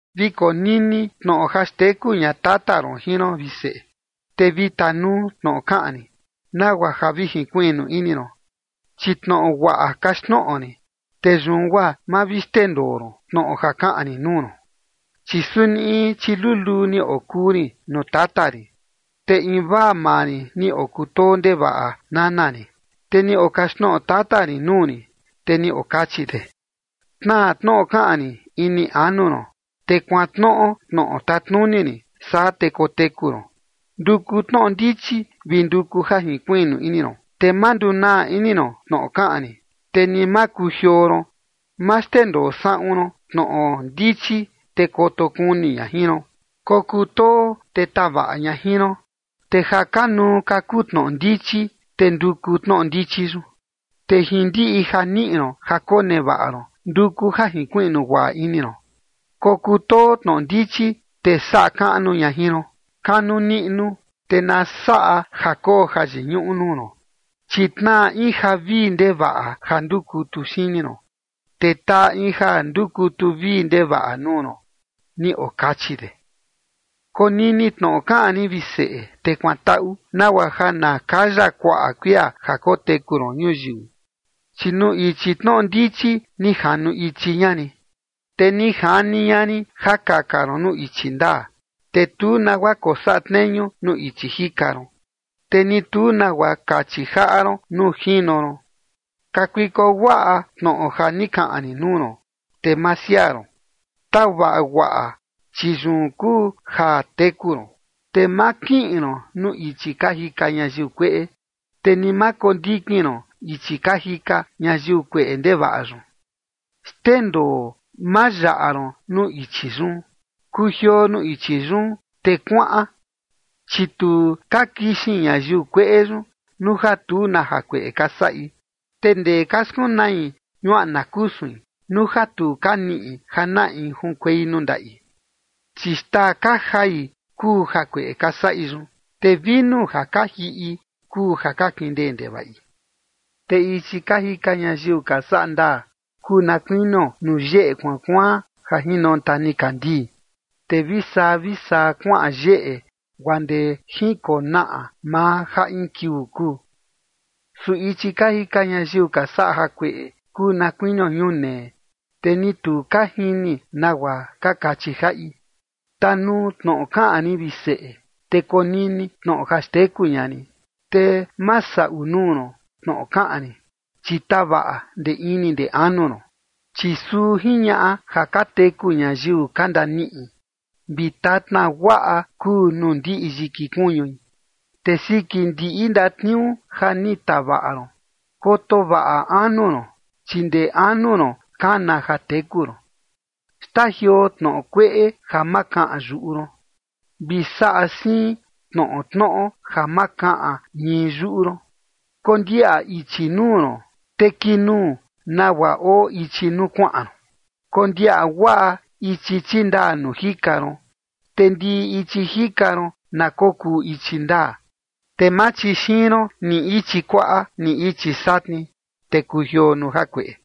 Vi konini tnoꞌo ja xteku ña tata ron jin ron, vi seꞌe, te vi tanuu tnoꞌo kaꞌan rin, nagua ja vi jinkuiꞌnu ini ron. Chi tnoꞌo guaꞌa kaxtnoꞌo rin, te yun guaa ma vi xndendoo ron tnoꞌo ja kaꞌan rin nuu ron. Chi suni in chiluluu ni okuu rin nuu tata rin, te invaa maa rin ni okutoo ndevaꞌa nana rin. Te ni okaxtnoꞌo tata rin nuu rin, te ni okachi de: “Tnaa tnoꞌo kaꞌan rin ini anu ron, te kuantnoꞌo tnoꞌo tatnuni rin, saa te koteku ron. Nduku tnoꞌo ndichi, vi nduku ja jinkuiꞌnu ini ron, te ma ndunaa ini ron tnoꞌo kaꞌan rin, te ni ma kujioo ron. Ma xndendoo saꞌun ron tnoꞌo ndichi, te koto kuni ña jin ron. Kokutoo, te tavaꞌa ña jin ron. Te ja kanuu ka kuu tnoꞌo ndichi, te nduku tnoꞌo ndichi yun. Te jin ndiꞌi ja niꞌi ron ja konevaꞌa ron, nduku ja jinkuiꞌnu guaꞌa ini ron. Kokutoo tnoꞌo ndichi, te saꞌa kaꞌnu ña jin ron. Kanu niꞌnu, te na saꞌa ja koo jayiñuꞌu nuu ron. Chi tnaa in ja vii ndevaꞌa ja ndukutu xini ron, te taa in ja ni ndukutu vii ndevaꞌa nuu ron”, ni okachi de. Konini tnoꞌo kaꞌan rin, vi seꞌe, te kuantaꞌu, nagua ja na kaya kuaꞌa kuia ja koteku ron ñuyiu. Chi nuu ichi tnoꞌo ndichi ni janu ichi ña rin, te ni jani ña rin ja kaka ron nuu ichi ndaa. Te tu nagua kosaꞌa tneñu nuu ichi jika ron, te ni tu nagua kachi jaꞌa ron nuu jino ron. Kakuiko guaꞌa tnoꞌo ja ni kaꞌan rin nuu ron, te ma siaa ron. Tavaꞌa guaꞌa, chi yun kuu ja teku ron. Te ma kiꞌin ron nuu ichi ka jika ñayiu kueꞌe, te ni ma kondikin ron ichi ka jika ñayiu kueꞌe ndevaꞌa yun. Xndendoo, ma yaꞌa ron nuu ichi yun. Kujioo nuu ichi yun, te kuaꞌan. Chi tu ka kixin ñayiu kueꞌe yun nuu ja tu na jakueꞌe ka saꞌi. Te ndee ka skunai ñuaꞌna kusuin nuu ja tu ka niꞌi ja na in junkuei nuu ndaꞌi. Chi xtaa ka jai kuu jakueꞌe ka saꞌi yun, te vinu ja ka jiꞌi kuu ja ka kindee ndevaꞌi. Te ichi ka jika ñayiu ka saꞌa ndaa kuu na kuinio nuu yeꞌe kuaan kuaan ja jinonta nikandii, te vi saa vi saa kuaꞌan yeꞌe guaa ndee jinkonaꞌa maa ja in kiuu kuu. Su ichi ka jika ñayiu ka saꞌa jakueꞌe kuu na kuinio ñunee, te ni tu ka jini nagua ka kachi jaꞌi. Tanuu tnoꞌo kaꞌan rin, vi seꞌe, te konini tnoꞌo ja xteku ña rin. Te ma saꞌu nuu ron tnoꞌo kaꞌan rin, chi tavaꞌa ndee ini ndee anu ron. Chi suu jiñaꞌa ja ka teku ñayiu ka ndaniꞌi, vi tatna guaꞌa kuu nuu ndiꞌi yiki kuñui. Te siki ndiꞌi ndatniuu ja ni tavaꞌa ron, koto vaꞌa anu ron, chi ndee anu ron kana ja teku ron. Xtajioo tnoꞌo kueꞌe ja ma kaꞌan yuꞌu ron, vi saꞌa siin tnoꞌo tnoꞌo ja ma kaꞌan ñii yuꞌu ron. Kondiaꞌa ichi nuu ron, te kinuu nagua oo ichi nuu kuaꞌan ron. Kondiaꞌa guaꞌa ichi chindaa nuu jika ron, te ndiꞌi ichi jika ron na kokuu ichi ndaa. Te ma chixiin ron ni ichi kuaꞌa ni ichi satni, te kujioo nuu jakueꞌe.